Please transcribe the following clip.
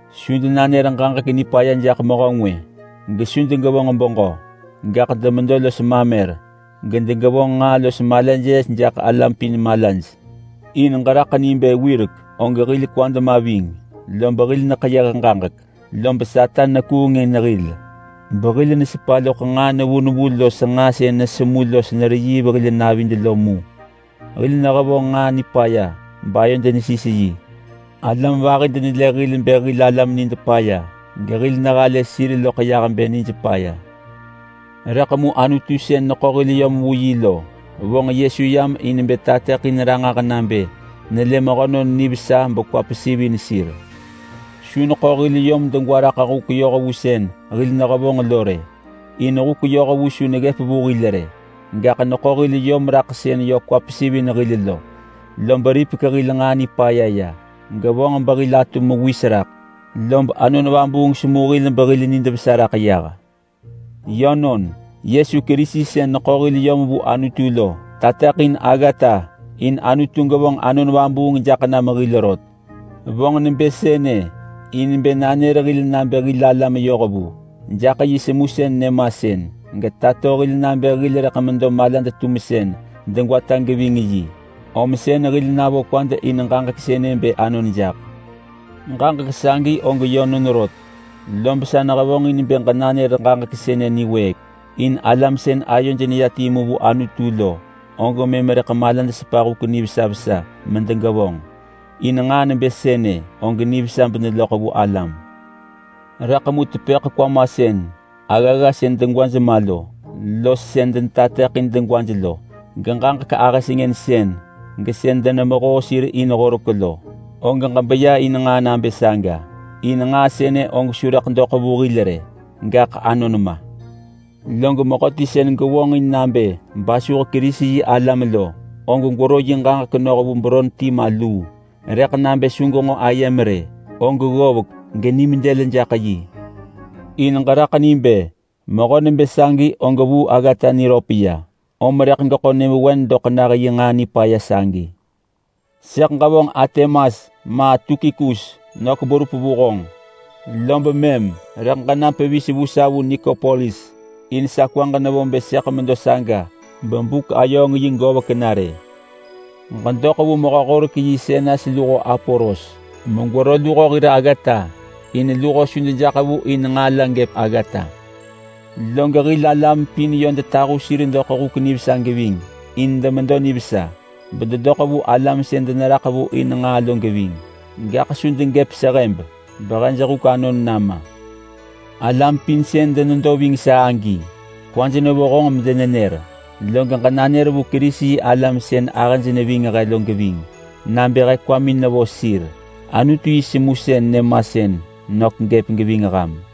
Su denanër ġaġek nipaya jaḳ mehö ngwë, gesu degevonġ beġö. Gaḳ demedo los mamer, gedegevonġ nġaa los malaj yes jaḳ alam pin malaj. In ġeraḳ ni bë wirek og hil kwad ma ving. Lob hil neḳeyëh ġaġek. Lob Satan nekuung in hil, behil nesepa loḳ nġaa nevu nevu los nġaa sën nesemu los nereyiiv hil navid lo mu. Hil nehevonġ nġaa nipaya bayod nesis yi. Alam vahi denelë hil bë hil alam nid paya, gehil nehalë sir loḳ yah bë nij paya. Rëḳ mu Anutu sën neḳo hil yom vu yi lo, vonġ Yesu yam in bë tateḳin ranġah nabë nelë mehönon nivesa bekwa pesivin sir. Su neḳo hil yom degwa raḳ huk yohvu sën hil nehevonġ lo rë, in huk yohvu su neggëp vu hil rë. Gaḳ neḳo hil yom raḳ sën yö kwa pesivin hil lo. Lob ripek hil nġaa nipaya ya, gevonġ behil atu mewis raḳ. Lob Anon Vabuung semu hil behil nid vesa raḳ yah. Yönon, Yesu Kerisi sën neḳo hil yom vu Anutu lo tateḳin aggata in Anutu gevonġ Anon Vabuung jaḳ nam hil rot. Vonġ nebë sënë in bë nanër hil nabë hil alam yohvu jaḳ yi semusën nyëmasën, getato hil nabë hil rëḳ medo malad-tumsën degwata geving yi. Om sën hil navo kwad in ġaġek sënë bë anon jaḳ. Ġaġek sagi og yönon rot. Lob sa nehevonġin bë ġenanër ġaġek sënë niwëëk, in alam sën ayoj neya timu vu Anutu lo og mëm rëḳ malaj sepa huk nivesa vesa medegevonġ. In nġaa nebë sënë og nivesa beneloḳ vu alam. Rëḳ mu tepëḳ kwamasën aggagga sën degwaj ma lo, los sën denetateḳin degwaj lo, geġaġek ahë sengënsën, gesën denemehoo sir in horek lo, og ġebeya in nġaa nabë saga. In nġaa sënë og su rëḳ doḳ vu hil rë, gaḳ anon ma. Log mehöti sën gevonġin nabë basuh Kerisi-yi-alam lo, og gwero yi ġaġek noh vu beron ti ma luu. Rëḳ nabë su genġo ayem rë, og ggovek, genim dël jaḳ yi. In ġeraḳ ni bë mehö nebë sagi og vuu aggata niröp ya, om rëḳ geḳo nyëvewen doḳ nah yi nġaa nipaya sagi. Sëḳ ġevonġ Artemas ma Tukikus nök berup vu honġ, lob mëm rëḳ ġenam pevis vu sa vu Nikopolis. In sa kwaġ nevo bë sëḳ medo saga bebuk-ayööng-yi govek na rë. Ġedoḳ vu mehö-horek-yi Senas luho Apolos megwero luho hir aggata in luho su dejaḳ vu in nġaa la gëp aggata. Log hil alam pin yö detahu sir doḳ huk nivesa geving in demedo nivesa, bededoḳ vu alam sën deneraḳ vu in nġaa lo geving. Gaḳ su degëp sehëb behej huk anon nama. Alam pin sën denedo ving sa agi kwaj nevo honġ medenenër. Log ġenanër vu Kerisi-yi-alam sën ahëj neving he lo geving, nabë he kwamin nevo sir. Anutu yi semusën nyëmasën nök gëp geving ham.